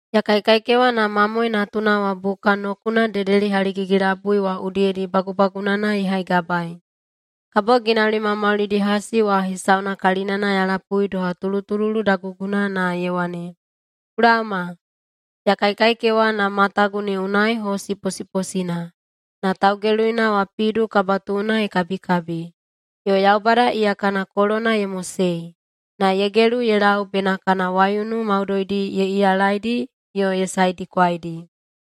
Ya kaikaikewa na Mamoe Natuna wa buka nokuna dedeli haligigi-labui wa udiyedi bagubagunana ye haigabaei. Kabo ginauli maumaulidi hasi wa hesauna kalinana ya lapui doha tulutululu daguguna na ye wane, “Ku laoma!” Ya kaikaikewa na matagu ne unai hosi posiposina, na taugeluina wa pidu kabatuuna ye kabikabi. Yo Yaubada iya kana kolona ye mosei, na ye gelu ye lau bena kana waiunu maudoidi ye iyalaidi yo ye saedikwaidi.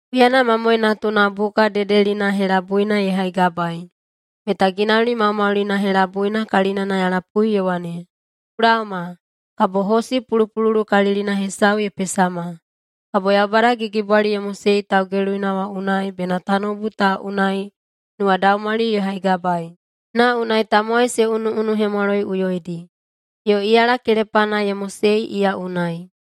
Huyana Mamoe Natuna buka dedelina helabuina ye haigabaei, meta ginauli maumaulina helabuina kalinana ya lapui ye wane, “Ku laoma!” Kabo hosi pulupululukalilina hesau ye pesama. Kabo Yaubada gigibwali ye mosei taugeluina wa unai bena tanoubu ta unai nuwadaumwali ye haigabaei, na unai tamowai se unuꞌunuhemwaloiꞌuyoidi. Yo iyala kelepana ye mosei iya unai.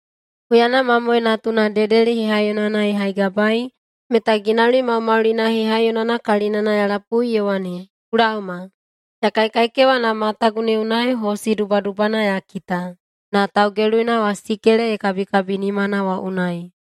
Huyana Mamoe Natuna dedeli hehaiyonana ye haigabaei, meta ginauli maumaulina hehaiyonana kalinana ya lapui ye wane, “Ku laoma!” Ya kaikaikewa na matagu ne unai hosi dubadubana ya kita, na taugeluina wa sikele ye kabikabi nimana wa unai.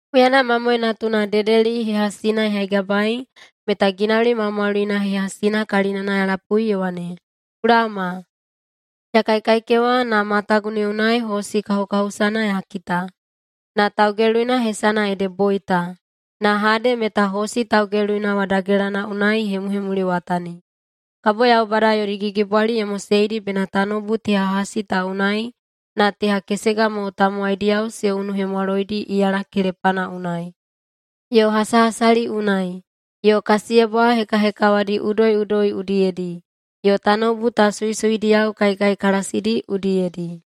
Huyana Mamoe Natuna dedeli hehasina ye haigabaei, meta ginauli maumaulina hehasina kalinana ya lapui ye wane, “Ku laoma!” Ya kaikaikewa, na matagu ne unai hosi kahukahusana ya kita! Na taugeluina hesana ede Boita, na Hade meta hosi taugeluina wa dagelana unai ye hemuhemuliwatani. Kabo Yaubada yodi gigibwali ye moseidi bena tanoubu teha hasi ta unai na teha kesega mo tamowaidiyao se unuhemwaloidi iyala kelepana unai, yo hasahasali unai, yo kasiyebwa hekahekawadi udoiꞌudoi udiyedi, yo tanoubu ta suisuidiyao kaikaikalasidi udiyedi.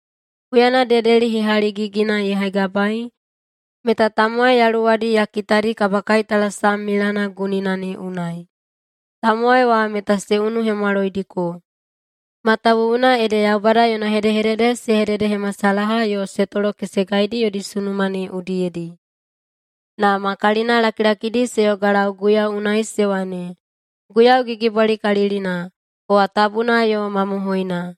Huyana dedeli hehaligigina ye haigabaei, meta tamowai yaluwadi ya kitadi kabakaitalasam milana gunina ne unai. Tamowai wa meta se unuhemwaloidiko, matawuwuna ede Yaubada yona hedehedede se hededehemasalaha yo se tolokesegaidi yodi sunuma ne udiyedi. Na ma kalinalakilakidi se yogalau Guiyau unai se wane, “Guiyau Gigibwalikalilina, kowa tabuna yo mamohoina!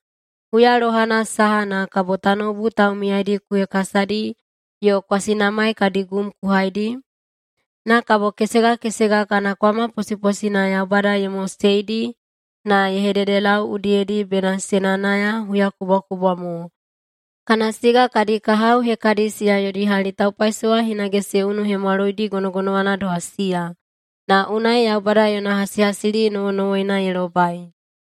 Huya lohana saha na kabo tanoubu taumiyaidi ku hekasadi yo kwasinamai kadi gum ku haidi?” Na kabo kesega kesega kana kwama posiposina Yaubada ye moseidi na ye hededelau udiyedi bena se nayanaya huyakubwakubwa mo, kana siga kadi kahao hekadi siya yodi hali taupaisowa hinage se unuhemwaloidi gonogonowana doha siya, na unai Yaubada yona hasihasili nowonowoina ye lobai.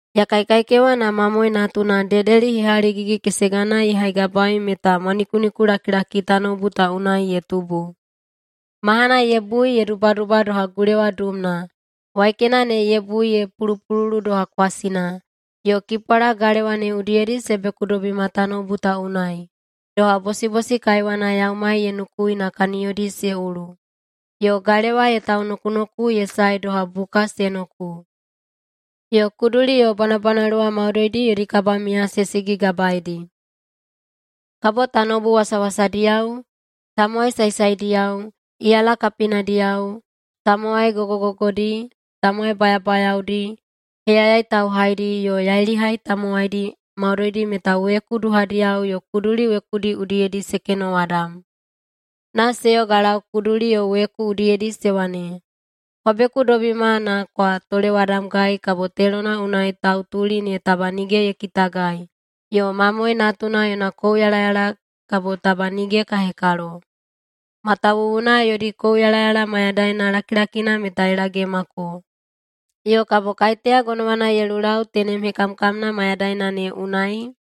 Ya kaikaikewa na Mamoe Natuna dedeli hehaligigi-kesegana ye haigabaei meta mwanikunikulakilaki tanoubu ta unai ye tubu. Mahana ye bui ye dubaduba doha gulewa duumna. Waikena ne ye bui ye pulupululu doha kwasina, yo kipwala galewa ne udiyedi se bekudobima tanoubu ta unai, doha bosibosi kaiwana yaumai ye nukui na kaniyodi se ulu. Yo galewa ye taunokunoku ye sae doha buka se noku. Yo kuduli yo bwanabwanaluwa maudoidi yodi kabamiya se sigigabaedi. Kabo tanoubu wasawasadiyao, tamowai saesaediyao, iyala kapinadiyao, tamowai gogogogodi, tamowai bayabayaodi, heyayai tauhaidi, yo yailihai tamowaidi, maudoidi meta weku duhadiyao yo kuduli wekudi udiyedi se kenowadam. Na se yogalau kuduli yo weku udiyedi se wane, “Kwa bekudobima na kwa tolewadamgai kabo telona unai tautuli ne taba nige ye kitagai yo Mamoe Natuna yona kouyalayala kabo taba nige ka hekalo! Matawuwuna yodi kouyalayala mayadaina lakilakina meta ye laomako. Yo kabo kaiteya gonowana ye lulau tenem hekamkamna mayadaina ne unai?”